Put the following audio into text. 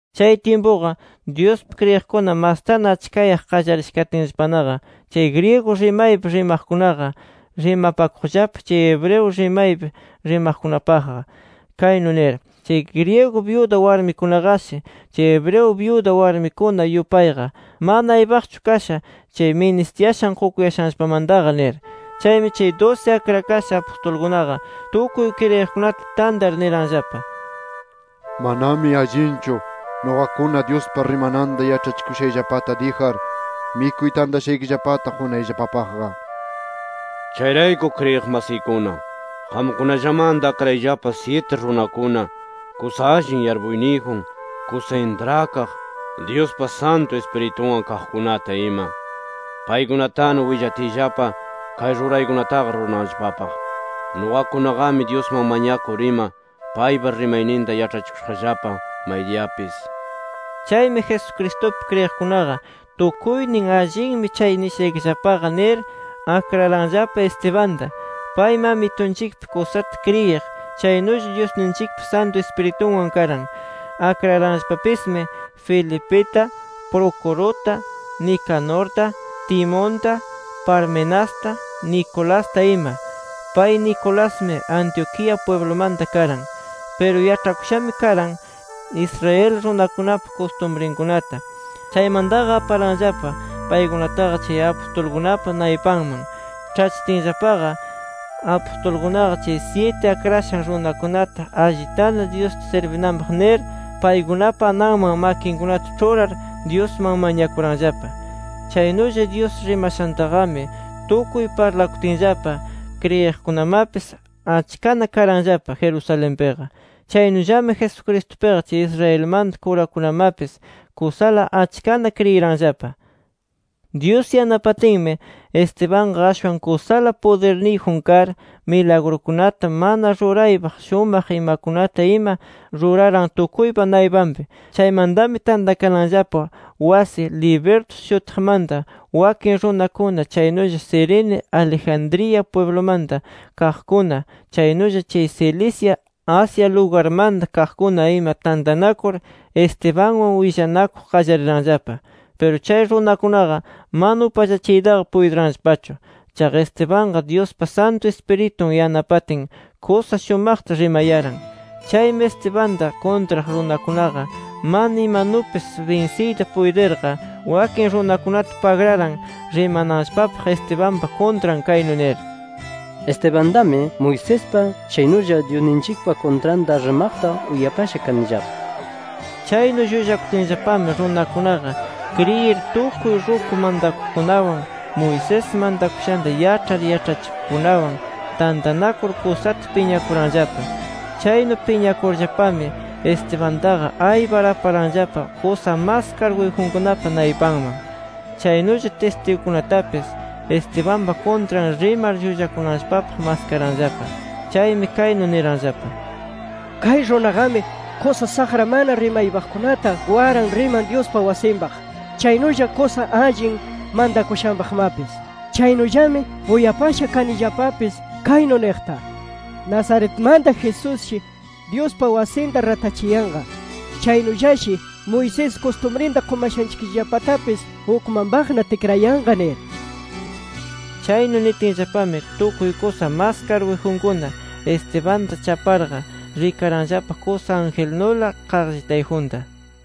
Chay tyimpuqa Dyuspi kriyiqkuna mastana achkayaq qallarisha katinllapanaqa, chay griego rimaypi rimaqkunaqa rimapakuqllapa chay hebreo rimaypi rimaqkunapaqqa, kaynu nir: “Chay griego byuda warmikunaqashi, chay hebreo byuda warmikuna yupayqa mana aypaqchu kasha chay ministiyashan qukuyashanllapamantaqa” nir. Chaymi chay dusi akrakasha apustulkunaqa, tukuy kriyiqkunata tantar niranllapa: —Manami allinchu nuqakuna Dyuspa rimananta yaĉhachikuyashayllapata dijar, mikuy tantashanchikllapata qukunayllapapaqqa. Chayrayku kriyiq masiykuna, qamkunallamanta akrayllapa syiti runakuna, kusa allin yarpuyniyjun, kusa intrakaq, Dyuspa Santu Ispiritunwan kaqkunata ima. Paykunatana willatiyllapa, kay ruraykunataqa rurananllapapaq. Nuqakunaqami Dyusman mañakur ima, paypa rimayninta yaĉhachikushaqllapa maydiyapis nir. Chaymi Jesucristupi kriyiqkunaqa tukuynin “Allinmi chay nishaykillapaqa” nir, akraranllapa Estebanta. Paymi Amitunchikpi kusata kriyiq, chaynulla Dyusninchikpa Santu Ispiritunwan karan. Akraranllapapismi: Felipita, Procuruta, Nicanorta, Timonta, Parmenasta, Nicolasta ima. Pay Nicolasmi Antioquía pwiblumanta karan. Piru yaĉhakushami karan Israel runakunapa kustumrinkunata. Chaymantaqa aparanllapa paykunataqa chay apustulkunapa naypanman. Ĉhachitinllapaqa apustulkunaqa, chay syiti akrakashan runakunata, allitana Dyusta sirbinanpaq nir, paykunapa ananman makinkunata ĉhurar, Dyusman mañakuranllapa. Chaynulla, Dyus rimashantaqami tukuy parlakutinllapa, kriyiqkunamapis achkana karanllapa Jerusalenpiqa. Chaynullami, Jesucristupiqa chay Israelmanta kurakunamapis kusala achkana kriyiranllapa. Dyus yanapatinmi, Estebanqa ashwan kusala pudirniyjun kar, milagrukunata, mana ruraypaq shumaq imakunata ima ruraran tukuypa naypanpi. Chaymantami tantakananllapa wasi Libertos shutiqmanta wakin runakuna, chaynulla Cirene, Alejandría pwiblumanta kaqkuna, chaynulla chay Cilicia, Asia lugarmanta kaqkuna ima tantanakur, Estebanwan willanakuq qallariranllapa. Piru chay runakunaqa mana upallachiytaqa puytiranllapachu. Chaqa Estebanqa, Dyuspa Santu Ispiritun yanapatin, kusa shumaqta rimayaran. Chaymi Estebanta kuntraq runakunaqa mana imanupis binsiyta puytirqa, wakin runakunata pagraran rimananllapapaq Estebanpa kuntran kaynu nir: “Estebantami, Moisespa, chaynulla Dyusninchikpa kuntranta rimaqta uyapasha kanillapa” nir. Chaynu llullakutinllapami, runakunaqa kriyir tukuy ruku mantakuqkunawan, Moisés mantakushanta yaĉhar yaĉhachikuqkunawan tantanakur kusata piñakuranllapa. Chaynu piñakurllapami Estebantaqa aypar aparanllapa kusa mas karguyjunkunapa naypanman. Chaynulla tistigukunatapis, Estebanpa kuntran rimar llullakunanllapapaq maskaranllapa. Chaymi kaynu niranllapa: —Kay runaqami kusa saqra mana rimaypaqkunata waran riman Dyuspa wasinpaq, chaynulla kusa allin mantakushanpaqmapis. Chaynullami uyapasha kanillapapis kaynu niqta: ‘Nazaretmanta Jesusshi, Dyuspa wasinta ratachiyanqa. Chaynullashi Moisés kustumrinta qumashanchikllapatapis ukmanpaqna tikrayanqa’ nir. Chaynu nitinllapami, tukuy kusa mas karguyjunkuna, Estebanta chaparqa, rikaranllapa kusa angelnula qaqllitayjunta.